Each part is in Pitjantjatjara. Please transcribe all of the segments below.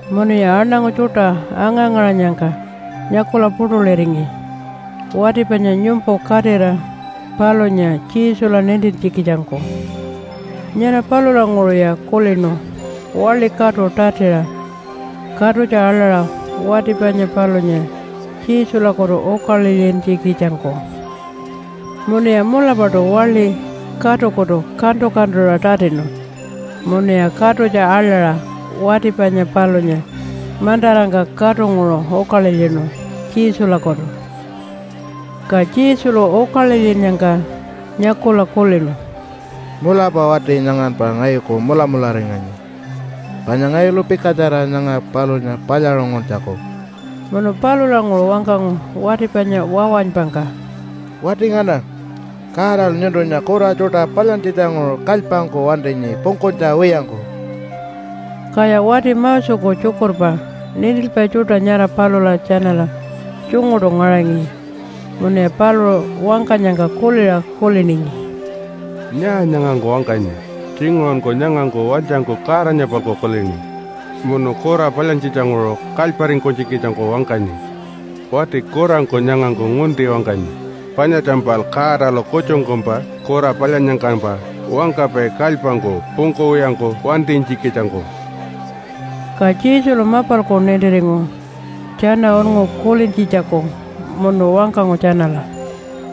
Munuya aṉangu tjuṯa anga-ngaṟanyangka nyakula puṯuliringi wati panya nyumpu katira palunya Jesula nintintjikitjangku. Nyara palulanguṟuya kulinu waḻi katu tatiṟa katutja aḻaṟa wati panya palunya Jesulakutu ukalilyintjikitjangku. Munuya mulapaṯu waḻi katukutu kantu-kantuṟa tatinu munuya katutja aḻaṟa wati panya palunya mantarangka katunguṟu ukalilyinu Jesulakutu. Ka Jesulu ukalilyinnyangka nyakula kulinu, “Mulapa wati nyanganpa ngayuku mulamularinganyi panya ngayulu pikatjara nyanga palunya palyaṟunguntjaku.” Munu palulanguṟu wangkangu wati panya wawanypangka, “Wati ngana, Godalu nyuntunya kura tjuṯa palyantjitjanguṟu kalypangku wantinyi pungkunytja wiyangku.” Kaya wati Moseku tjukurpa nintilpai tjuṯa nyara palula tjanala tjunguṯu ngaṟangi munuya paluṟu wangkanyangka kuliṟa kuliningi, “Nyaa nyangangku wangkanyi? Tjinguṟunku nyangangku walytjangku Godanya-palku kulini munu kura palyantjitjanguṟu kalyparingkunytjikitjangku wangkanyi. Wati kurangku nyangangku ngunti wangkanyi. Panyatjampal Godalu kutjungkumpa kura palyannyangkampa wangkapai kalypangku pungkuwiyangku wantinytjikitjangku.” Ka Jesulu mapalku nintiringu tjana unngu kulintjitjaku munu wangkangu tjanala,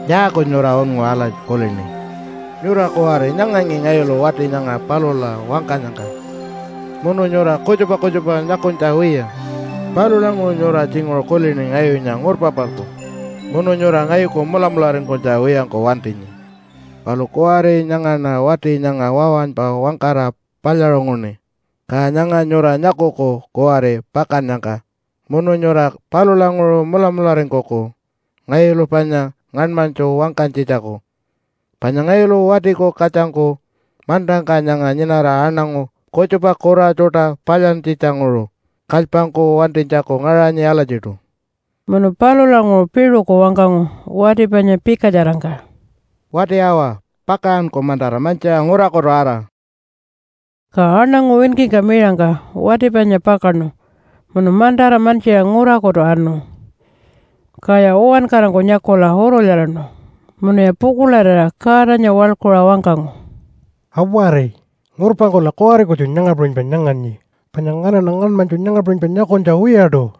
“Nyaaku nyura unngu alatji kulini? Nyura kuwari nyangangi ngayulu wati nyanga palula wangkanyangka munu nyura kutjupa kutjupa nyakunytja wiya. Palulanguṟu nyura tjinguṟu kulini ngayunya ngurpa-palku, munu nyura ngayuku mulamularingkunytja wiyangku wantinyi. Palu kuwari nyangaṉa wati nyanga wawanypa wangkara palyaṟunguṉi. Ka nyanga nyura nyakuku kuwari pakannyangka munu nyura palulanguṟu mulamularingkuku ngayulu panya ngaṉmanytju wangkanytjitjaku, panya ngayulu Watiku Katjangku mantangka nyanga nyinara aṉangu kutjupa kura tjuṯa palyantjitjanguṟu kalypangku wantinytjaku ngaṟanyi alatjiṯu.” Munu palulanguṟu piṟuku wangkangu wati panya pikatjarangka, “Wati awa, pakaṟanku mantara mantjiṟa ngurakutu ara.” Ka aṉangu winkingka miṟangka wati panya pakaṉu munu mantara mantjiṟa ngurakutu anu. Kaya uwankarangku nyakula urulyaraṉu munuya pukuḻarira Godanya waḻkuṟa wangkangu, “Awari! Ngurpangkula kuwari kutju nyanga puṟunypa nyanganyi panya nganaṉa ngaṉmanytju nyanga puṟunypa nyakunytja wiyaṯu.”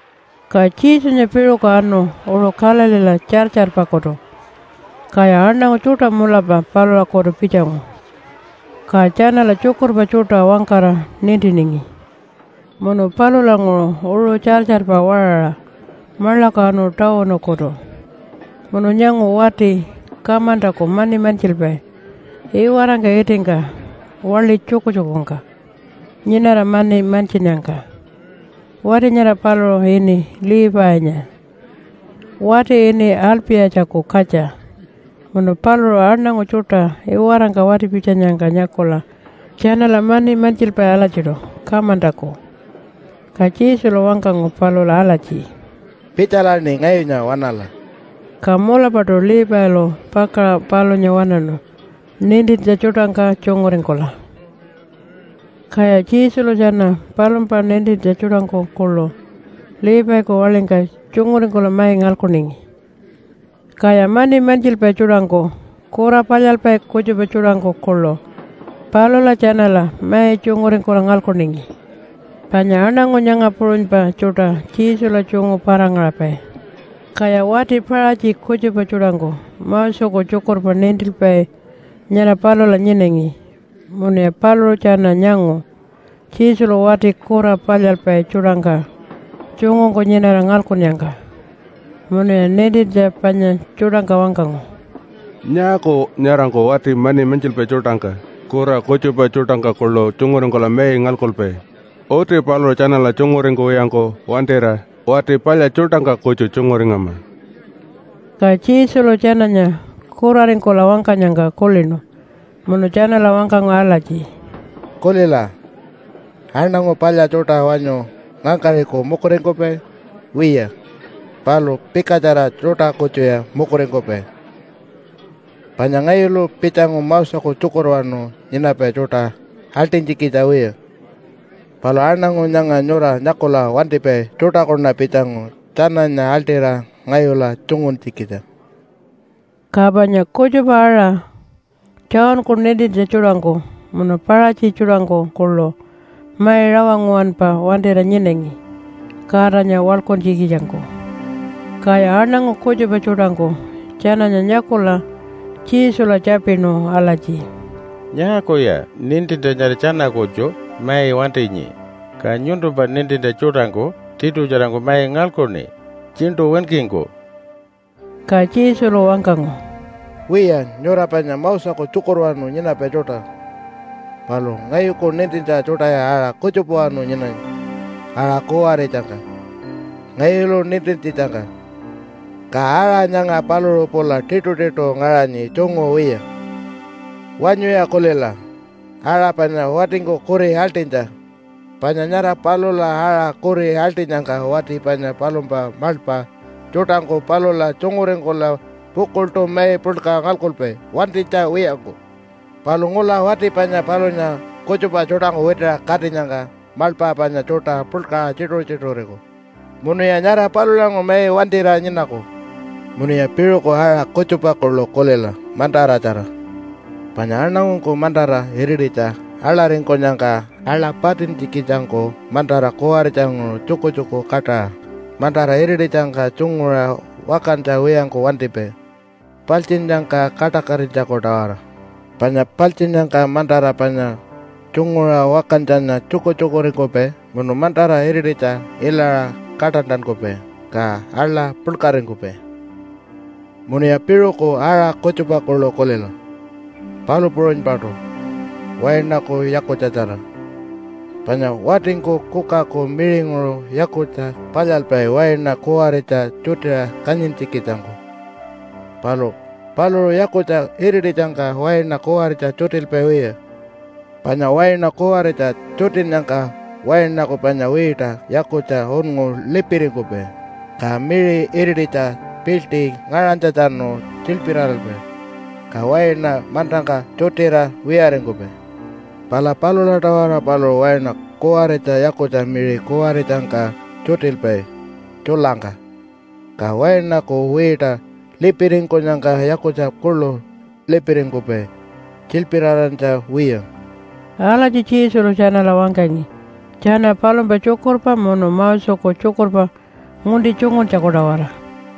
Ka Jesunya piṟuku anu uṟu Galileela tjartjarpakutu. Kaya aṉangu tjuṯa mulapa palulakutu pitjangu, ka tjanala tjukurpa tjuṯa wangkara nintiningi. Munu palulanguṟu uṟu tjartjarpa waṟaṟa maḻaku anu tawunukutu munu nyangu wati kamantaku mani mantjilpai iwarangka itingka waḻi tjukutjukungka nyinara mani mantjinnyangka. Wati nyara paluṟu ini Levinya wati ini Alpi-yatjaku katja munu paluṟu aṉangu tjuṯa iwarangka wati-pitjanyangka nyakula tjanala mani mantjilpai alatjiṯu kamantaku. Ka Jesulu wangkangu palula alatji, “Pitjalaṉi ngayunya waṉala!” Ka mulapaṯu Levilu pakaṟa palunya waṉaṉu nintintja tjuṯangka tjunguringkula. Kaya Jesulu tjana palumpa nintintja tjuṯangku kuḻu Leviku waḻingka tjunguringkula mai ngalkuningi. Kaya mani mantjilpai tjuṯangku, kura palyalpai kutjupa tjuṯangku kuḻu palula tjanala mai tjunguringkula ngalkuningi, panya aṉangu nyanga puṟunypa tjuṯa Jesula tjungu para-ngaṟapai. Kaya wati Paṟatji kutjupa tjuṯangku Moseku tjukurpa nintilpai nyara palula nyinangi, munuya paluṟu tjana nyangu Jesulu wati kura palyalpai tjuṯangka tjungungku nyinara ngalkunnyangka. Munuya nintintja panya tjuṯangka wangkangu, “Nyaaku nyarangku wati mani mantjilpai tjuṯangka, kura kutjupa tjuṯangka kuḻu tjunguringkula mai ngalkupai? Uti paluṟu tjanala tjunguringkuwiyangku wantira wati palya tjuṯangka kutju tjunguringama.” Ka Jesulu tjananya kuraringkula wangkanyangka kulinu munu tjanala wangkangu alatji, “Kulila, aṉangu palya tjuṯa wanyu ngangkaṟiku mukuringkupai? Wiya, palu pikatjara tjuṯa kutjuya mukuringkupai. Panya ngayulu pitjangu Moseku tjukurwanu nyinapai tjuṯa aḻṯinytjikitja wiya, palu aṉangu nyanga nyura nyakula wantipai tjuṯakuṉa pitjangu tjananya aḻṯira ngayula tjunguntjikitja.” Ka panya kutjupa-aṟa Johnku nintintja tjuṯangku munu Paṟatji tjuṯangku kuḻu mai rawa nguwanpa wantira nyinangi Godanya waḻkuntjikitjangku. Kaya aṉangu kutjupa tjuṯangku tjananya nyakula Jesula tjapinu alatji, “Nyaakuya nintintja nyara tjana kutju mai wantinyi, ka nyuntumpa nintintja tjuṯangku tiṯutjarangku mai ngalkuṉi tjiṉṯu winkingku?” Ka Jesulu wangkangu, “Wiya, nyura panya Moseku tjukurwanu nyinapai tjuṯa, palu ngayuku nintintja tjuṯaya aṟa kutjupawanu nyinanyi aṟa kuwaritjangka ngayulu nintintjitjangka, ka aṟa nyanga paluṟu pula tiṯitiṯu ngaṟanyi tjungu wiya. Wanyuya kulila aṟa panya watingku kuri aḻṯinytja, panya nyara palula aṟa kuri aḻṯinyangka wati panya palumpa maḻpa tjuṯangku palula tjunguringkula pukuḻṯu mai puḻka ngalkupai wantinytja wiyangku. Palu ngula wati panya palunya kutjupa tjuṯangku witiṟa katinyangka maḻpa panya tjuṯa puḻkaṟa tjituṟu-tjituṟuriku, munuya nyara palulanguṟu mai wantira nyinaku. “Munuya piṟuku aṟa kutjupa kuḻu kulila mantaratjara, panya aṉangungku mantara irititja aḻaringkunyangka aḻa patintjikitjangku mantara kuwaritjanguṟu tjukutjuku kaṯaṟa mantara irititjangka tjunguṟa wakantja wiyangku wantipai paltjinnyangka kaṯakatinytjaku-tawara. Panya paltjinnyangka mantara panya tjunguṟa wakantjanya tjukutjukuringkupai munu mantara irititja ilaṟa kaṯantankupai, ka aḻa puḻkaringkupai. “Munuya piṟuku aṟa kutjupa kuḻu kulila palu puṟunypaṯu wainaku yakutjatjara. Panya watingku kukaku miṟinguṟu yakutja palyalpai waina kuwaritja tjutiṟa kanyintjikitjangku. Palu paluṟu yakutja irititjangka waina kuwaritja tjutilpai wiya, panya waina kuwaritja tjutinnyangka wainaku panya wiṯa yakutja unngu lipiringkupai, ka miṟi irititja piḻṯi ngaṟanytjatjanu tjilpiraralpai, ka waina mantangka tjutira wiyaringkupai. Pala palula-tawara paluṟu waina kuwaritja yakutja miṟi kuwaritjangka tjutilpai tjulangka, ka wainaku wiṯa lipiringkunyangka yakutja kuḻu lipiringkupai tjilpirarantja wiya.” Alatji Jesulu tjanala wangkangi tjana palumpa tjukurpa munu Moseku tjukurpa ngunti tjunguntjaku-tawara.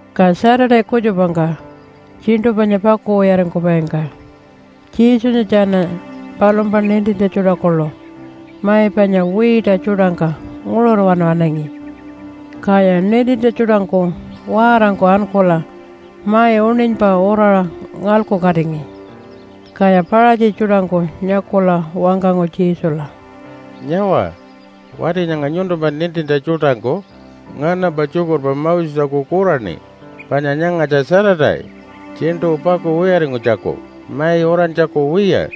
Ka Saturday kutjupangka tjiṉṯu panya pakuwiyaringkupaingka Jesunya tjana palumpa nintintja tjuṯa kuḻu mai panya wiita tjuṯangka nguṟurwanu anangi. Kaya nintintja tjuṯangku waarangku ankula mai uṉinypa uraṟa ngalkukatingi. Kaya Paṟatji tjuṯangku nyakula wangkangu Jesula, “Nyawa, wati nyanga nyuntumpa nintintja tjuṯangku nganampa tjukurpa Moseku kuraṉi, panya nyangatja Saturday tjiṉṯu pakuwiyaringkunytjaku, mai urantjaku wiya.”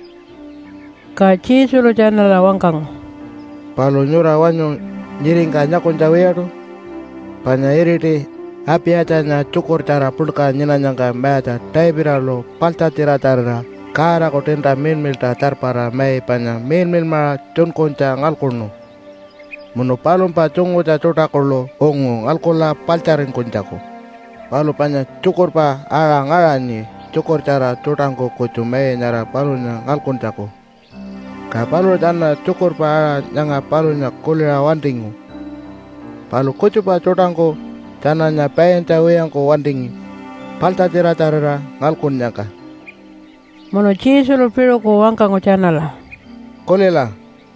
Ka Jesulu tjanala wangkangu, “Palu nyura wanyu nyiringka nyakunytja wiyaṯu panya iriti Apiyatjanya tjukurtjara puḻka nyinanyangka mayatja Davidalu paḻtjatjiratjarira Godaku tiinta miḻmiḻṯa tjarpara mai panya miḻmiḻmaṟa tjunkunytja ngalkuṉu munu palumpa tjungutja tjuṯa kuḻu ungu ngalkula paḻtjaringkunytjaku. Palu panya tjukurpa aṟa ngaṟanyi tjukurtjara tjuṯangku kutju mai nyara palunya ngalkuntjaku. Ka paluṟu tjana tjukurpa aṟa nyanga palunya kuliṟa wantingu, palu kutjupa tjuṯangku tjananya paintja wiyangku wantingi paḻtjatjiratjarira ngalkunnyangka.” Munu Jesulu piṟuku wangkangu tjanala, “Kulila,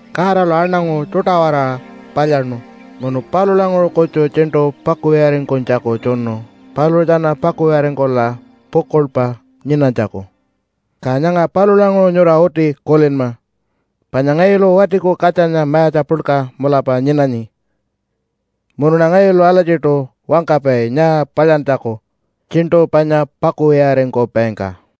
Godalu aṉangu tjuṯa-waraṟa palyaṉu munu palulanguṟu kutju tjiṉṯu pakuwiyaringkunytjaku tjunu paluṟu tjana pakuwiyaringkula pukuḻpa nyinanytjaku. Ka nyanga palulanguṟu nyura uti kulinma panya ngayulu Watiku Katjanya mayatja puḻka mulapa nyinanyi, munuṉa ngayulu alatjiṯu wangkapai nyaa palyantjaku tjiṉṯu panya pakuwiyaringkupaingka.”